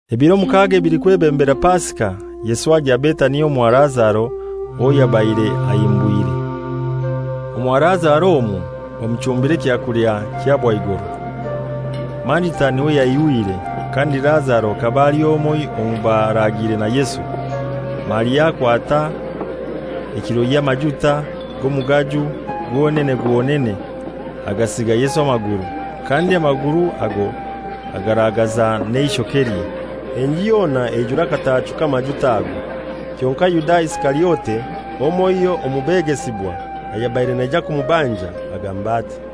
Ebiro mukaaga ebilikwebembera Pasika, Yesu agya Betania omwa Lazaro, owo yabaire ahimbwire. Omwa Lazaro omwo bamuchumbira ekyakulya kya bwaigoro; Marita n'iwe yaihwire, kandi Lazaro hakaba ali omoiho omu baraagiire na Yesu. Maria akwata ekilo y'amajuta g'omugaju gwonene gwonene, agasiiga Yesu amaguru, kandi amaguru ago agaragaza n'eishokelye. Enju yona eijura akatachu k'amajuta ago. Kyonkai Yuda Isikariote, omoiho omu begesibwa (ayabaire naija kumubanja), agamba ati,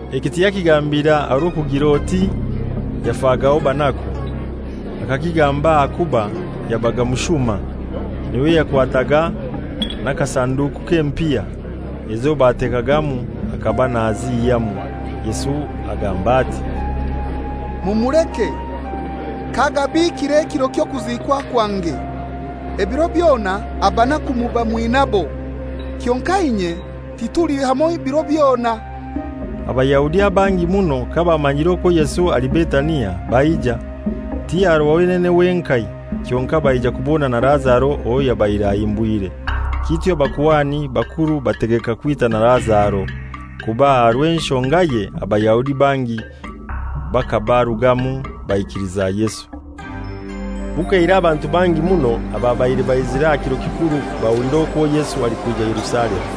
Eki tiyakigambire aha rw'okugir'oti yafagaho banaku. Akakigamba ahakuba yabaga mushuma. N'iwe yakwataga n'akasanduku k'empiha; ezo batekagamu hakaba nazihyamu. Yesu agamba ati, «Mumuleke, k'agabiikire ekiro ky'okuziikwa kwange. Ebiro byona abanaku muba mwinaibo, kyonkai inye tituli hamoi biro byona.» Abayahudi abangi muno kabamanyiire okwo Yesu ali Betania, baija, ti aha rwa wenene wenkai, kyonkai baija kubona na Lazaro owo yabaire ahimbwire. Kityo abakuhani bakuru bategeka kwita na Lazaro, kuba aha rw'enshongaye Abayahudi bangi bakabarugamu baikiliza Yesu. Bukeire abantu bangi muno ababaire baizire aha kiro kikuru bahulira okwo Yesu alikwija Yerusalemu.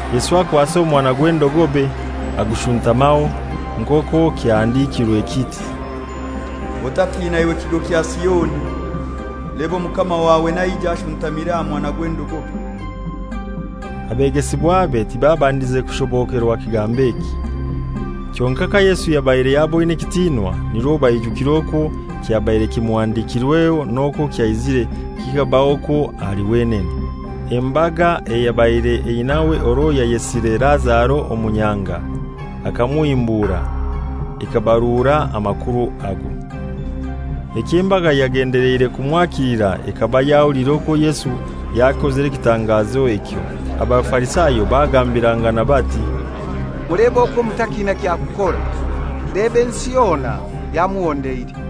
Yesu akwasa omwana gw'endogobe agushuntamaho; nk'okwo kyahandikirwe kiti, «Otatina iwe kigo kya Sioni, leeba omukama wawe naija, ashuntamire aha mwana gw'endogobe!» Abegesibwabe tibabandize kushobokerwa kigambo eki. Kyonkai ka Yesu yabaire yaboine ekitinwa nirwo baijukire okwo kyabaire kimuhandikirweho n'okwo kyaizire kikabahokwo ahali wenene. Embaga eyabaire einaiwe orwo yayesire Lazaro omu nyanga akamuhimbura ekabarura amakuru ago. Ekyo embaga yagendeleire kumwakilira ekaba yahuliire okwo Yesu yakozire ekitangazo ekyo. Abafarisayo bagambirangana bati, «Mulebe okwo mutakina kya kukora; leeba ensi yona yamuhondeire.»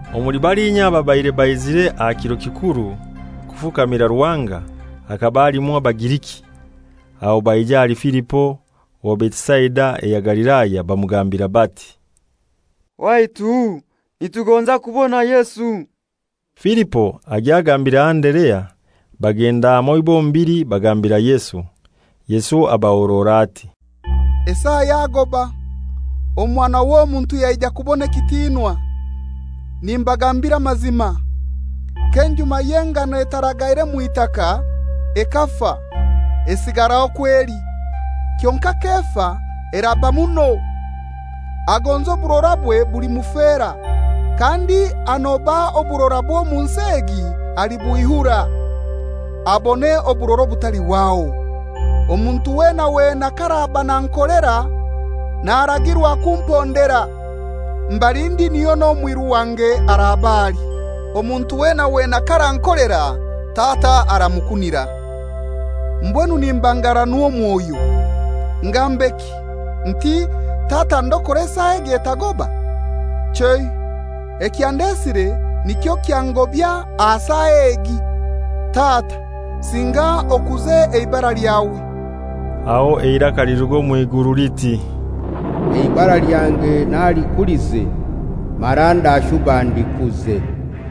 Omuli balinya ababaire baizire aha kiro kikuru kufukamira Ruhanga, hakaba halimu Abagiriki. Aho baija ahali Filipo owa Betisaida eya Galilaya, bamugambira bati, «Waitu, nitugonza kubona Yesu.» Filipo agya agambira Anderea; bagenda hamoi bombili bagambira Yesu. Yesu abahorora ati, «Esaa yagoba, Omwana w'Omuntu yaija kubona ekitinwa. Nimbagambira amazima, k'enjuma y'engano etaragaire mw'itaka ekafa, esigara okwo eli; kyonkai k'efa eraba muno. Agonza oburorabwe bulimufera, kandi anoba oburorabwe omu nsi egi alibwihura, abone oburora obutalihwaho. Omuntu wena wena k'araba nankolera, naragirwa kumpondera. Mbali ndi niho n'omwiru wange araba ali. Omuntu wena wena k'arankolera Tata aramukunira. «Mbwenu nimbanganwa omwoyo. Ngambeki? Nti, ‹Tata, ndokora esaa egi etagoba?› Chei, ekyandesire nikyo kyangobya aha esaa egi. Tata, singa okuze eibara lyawe.» Aho eiraka liruga omw'iguru liti, «Eibara lyange nalikulize, mara ndashuba ndikuze.»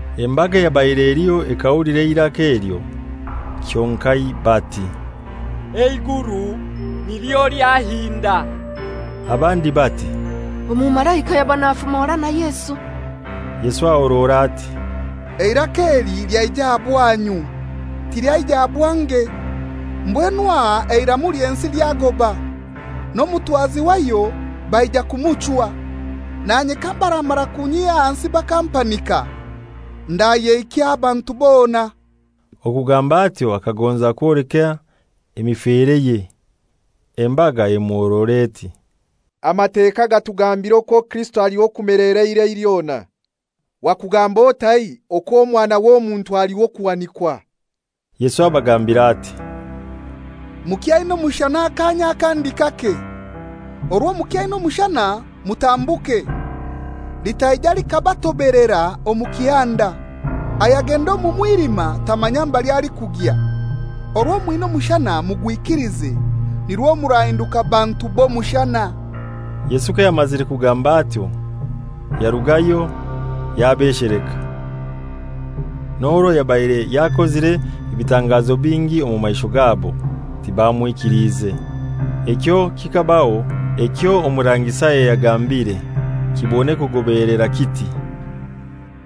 Embaga eyabaire eliho ekahulira eiraka elyo, kyonkai bati, «Eiguru nilyo lyahinda.» Abandi bati, «Omumalaika yaba nafumora na Yesu.» Yesu ahorora ati, «Eiraka eli lyaija aha bwanyu; tilyaija aha bwange. Mbwenu aha eiramu ly'ensi lyagoba, n'omutwazi wayo baija kumuchwa. Nanye kabaramara kunyiha ahansi bakampanika, ndayehikya abantu bona.» Okugamba atyo akagonza kwoleka emifereye. Embaga emuhorora eti, «Amateka gatugambira okwo Kirisito ali w'okumelera eirai lyona. Wakugamba otai okwo Omwana w'Omuntu ali w'okuhanikwa?» Yesu abagambira ati, «Mukyaina omushana akaanya akandi kake. Orwo mukyaina omushana mutambuke, litaija likabatobelera omu kihanda. Ayagenda omu mwilima tamanya mbali alikugya. Orwo mwina omushana mugwikilize, nirwo murahinduka bantu b'omushana.» Yesu kayamazire kugamba atyo, yarugayo yabesheleka. N'orwo yabaire yakozire ebitangazo bingi omu maisho gabo, tibamwikiliize. Ekyo kikabaho ekyo Omurangi Isaya yagambiire kibone kugobeelera, kiti,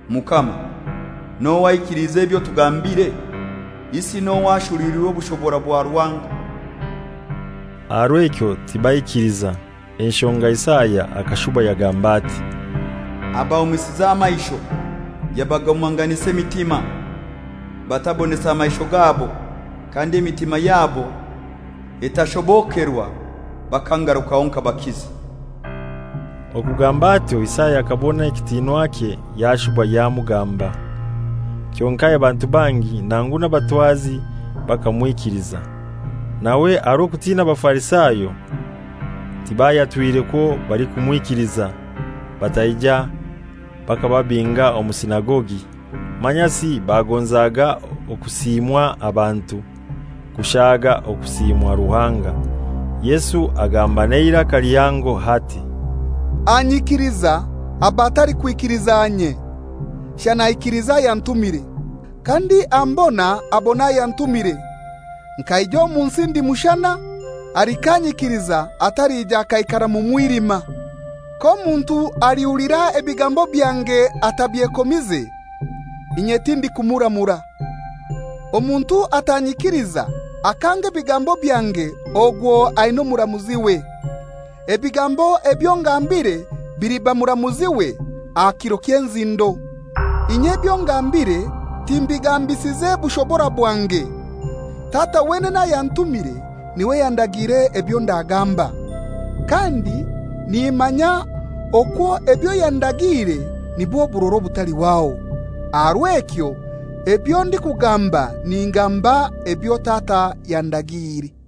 «Mukama, n'ohai aikiliize ebyo tugambire? Isi n'ohai ashuruliirwe obushobora bwa Ruhanga?» Aha rw'ekyo tibaikiliza. Enshonga Isaya akashuba yagamba ati, «Abahumisize amaisho, yabagumanganisa emitima, batabonesa maisho gabo kandi emitima yabo etashobokerwa bakangarukaho nkabakiza.» Okugamba atyo Isaya akabona ekitinwakye yashuba yamugamba. Kyonkai abantu bangi, nangu n'abatwazi bakamwikiliza, nawe aha rw'okutina Abafarisayo tibayatwire kwo balikumwikiliza, bataija bakababinga omu sinagogi. Manyasi bagonzaga okusiimwa abantu, kushaaga okusiimwa Ruhanga. Yesu agamba n'eiraka lihango ati, «Anyikiliza aba atalikwikiliza inye, shana aikiliza ayantumire. Kandi ambona abona ayantumire. Nkaija omu nsi ndi mushana, alikanyikiliza atalija akaikara mu mwilima. K'omuntu alikuhulira ebigambo byange atabyekomize, inye tindikumuramura. Omuntu atanyikiliza, akanga n'ebigambo byange ogwo aina omuramuziwe; ebigambo ebyo ngambire biliba muramuziwe aha kiro ky'enzindo. Inye ebyo ngambire timbigambisize bushobora bwange. Tata wenene ayantumire n'iwe yandagiire ebyo ndagamba. Kandi nimanya okwo ebyo yandagiire nibwo burora obutalihwaho. Aha rw'ekyo ebyo ndikugamba ningamba ebyo Tata yandagiire.»